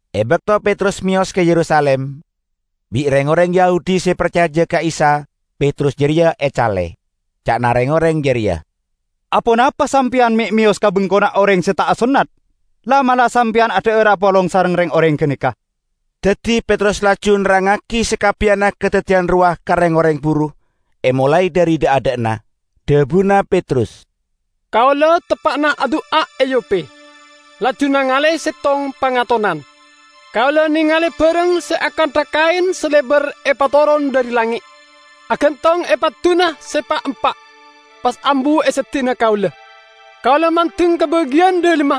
E bakto Petrus meyos ka Yerusalim, bi' reng-oreng Yahudi se parcaja ka Isa Petrus jareya ecale. Ca'na reng-oreng jareya, "Aponapa sampeyan me' meyos ka bengkona oreng se ta' asonnat? La'-mala' sampeyan adha'ar apolong sareng reng-oreng ganeka!" Daddi Petrus laju nerrangngagi sakabbiyanna kadaddiyan rowa ka reng-oreng buru, emolae dhari dha'-adha'na. Dhabuna Petrus, "Kaula teppa'na adu'a e Yope, laju nangale settong pangatonan. Kaula nengale barang se akantha kaen se lebar epatoron dhari langnge', agantong e padduna se pa'-empa', pas ambu e seddi'na kaula. Kaula mandeng ka bagiyan dhalemma,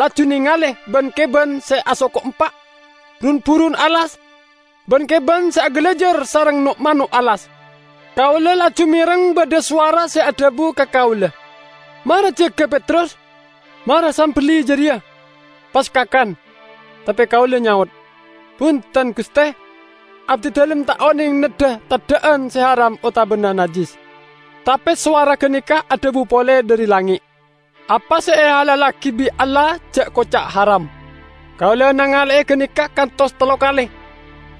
laju nengale ban-keban se asoko empa', run-burun alas, ban-keban se agalajar sareng no'-mano' alas. Kaula laju mereng badha sowara se adhabu ka kaula, 'Mara, jaga, Petrus. Mara sambelli jareya, pas kakan!' Tape kaula nyaot, 'Bunten, Guste! Abdidalem ta' oneng neddha teddha'an se haram otabana najjis.' Tape sowara ganeka adhabu pole dhari langnge', 'Apa se ehalallagi bi' Allah ja' koca' haram.' Kaula nangale'e ganeka kantos tello kale,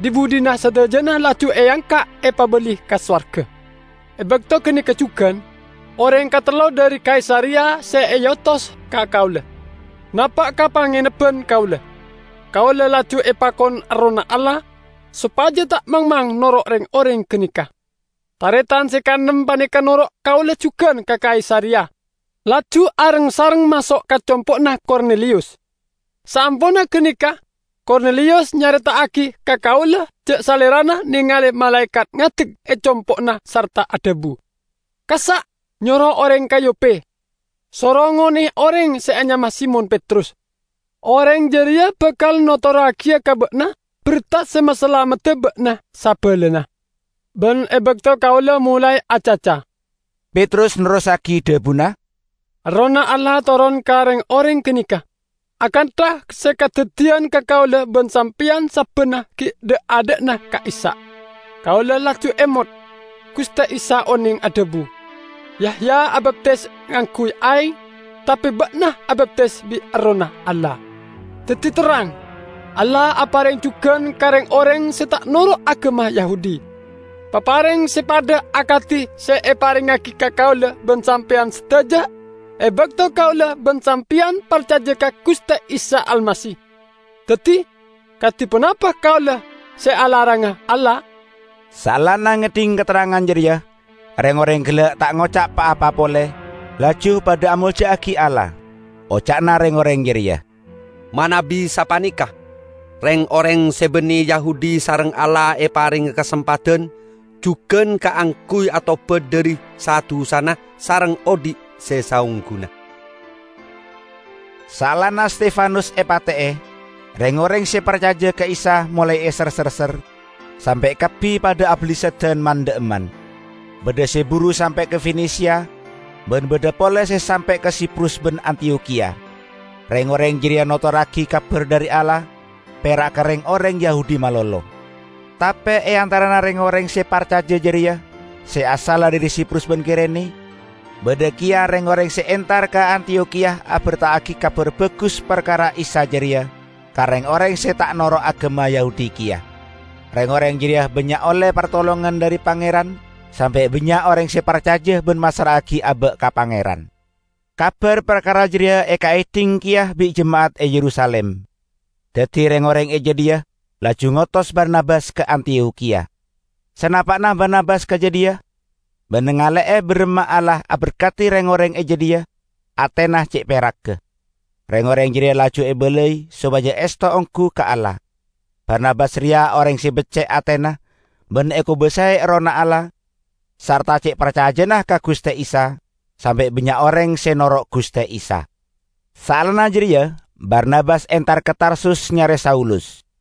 dhi-budhina sadajana laju eangka' epabali ka sowarga. E bakto ganeka jugan, oreng katello dhari Kaisareya se eotos ka kaula, napa' ka pangenebban kaula. Kaula laju epakon Errohna Allah sopaja ta' mangmang noro' reng-oreng ganeka. Taretan se kaennem paneka noro' kaula jugan ka Kaisareya, laju areng-sareng maso' ka compo'na Korneliyus. Saamponna ganeka Korneliyus nyareta'agi ka kaula ja' salerana nengale malaekat ngadek e compo'na sarta adhabu, 'Kassa' nyoro oreng ka Yope, soro ngone'e oreng se anyama Simon Petrus. Oreng jareya bakal notorragiya ka ba'na berta se masalamedda ba'na sabalana.' Ban e bakto kaula molae acaca," Petrus nerrossagi dhabuna, "Errohna Allah toron ka reng-oreng ganeka, akantha se kadaddiyan ka kaula ban sampeyan sabbanna gi' dha'-adha'na ka'issa'. Kaula laju emot, Guste Isa oneng adhabu, 'Yahya abaptis ngangguy aeng, tape ba'na abaptisa bi' Errohna Allah.' Daddi terrang, Allah apareng jugan ka reng-oreng se ta' noro' agama Yahudi, papareng se padha akadi se eparengngagi ka kaula ban sampeyan sadaja e bakto kaula ban sampeyan parcaja ka Guste Isa Almasih. Daddi, kadi ponapa kaula se alaranga Allah!" Saellana ngedhing katerrangan jareya, reng-oreng gella' ta' ngoca' pa-apa pole, laju padha amolja'agi Allah. Oca'na reng-oreng jareya, "Manabi sapaneka, reng-oreng se banne Yahudi sareng Allah eparenge kasempadan jugan kaangguy atobat dhari sa-dusana sareng odhi' se saongguna!" Saellana Stefanus epate'e, reng-oreng se parcaja ka Isa molae eser-serser, sampe' kabbi padha abalessadan man-dha'emman. Badha se buru sampe' ka Fenesia, ban badha pole se sampe' ka Siprus ban Antiyokhiya. Reng-oreng jareya notorragi Kabar dhari Allah pera' ka reng-oreng Yahudi malolo. Tape e antarana reng-oreng se parcaja jareya, se asalla dhari Siprus ban Kirene, badha keya reng-oreng se entar ka Antiyokhiya aberta'agi Kabar Bagus parkara Isa jareya ka reng-oreng se ta' noro' agama Yahudi keya. Reng-oreng jareya bannya' olle partolongan dhari Pangeran sampe' bannya' oreng se parcaja ban massra'agi aba' ka Pangeran. Kabar parkara jareya ekaedhing keya bi' jema'at e Yerusalim. Daddi reng-oreng e jadhiya laju ngotos Barnabas ka Antiyokhiya. Sanapa'na Barnabas ka jadhiya, ban nangale'e baramma Allah aberkadi reng-oreng e jadhiya, atena ce' peragga. Reng-oreng jareya laju ebalai sopaja esto onggu ka Allah. Barnabas reya oreng se becce' atena ban ekobasae Errohna Allah sarta ce' parcajana ka Guste Isa sampe' bannya' oreng se noro' Guste Isa. Saellana jareya Barnabas entar ka Tarsus nyare Saulus.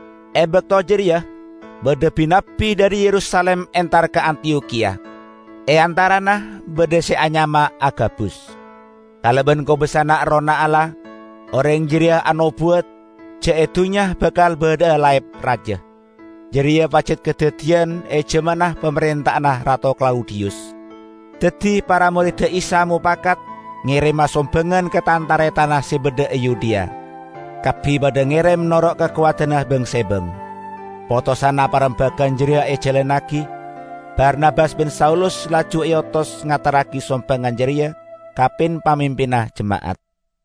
E bakto jareya badha bi-nabbi dhari Yerusalim entar ka Antiyokhiya. E antarana badha se anyama Agabus. Kalaban kobasana Errohna Allah, oreng jareya anobuwat ja' e dunnya bakal badha'a laep raja. (Jareya pajat kadaddiyan e jamanna pamarenta'anna Rato Klaudiyus.) Daddi para moredda Isa mopakat ngerema sombangan ka tan-taretanna se badha e Yudea; kabbi padha ngerem noro' kakowadanna bang-sebang. Potosanna parembagan jareya ejalannagi; Barnabas ban Saulus laju eotos ngaterragi sombangan jareya ka pin-pamimpinna jema'at.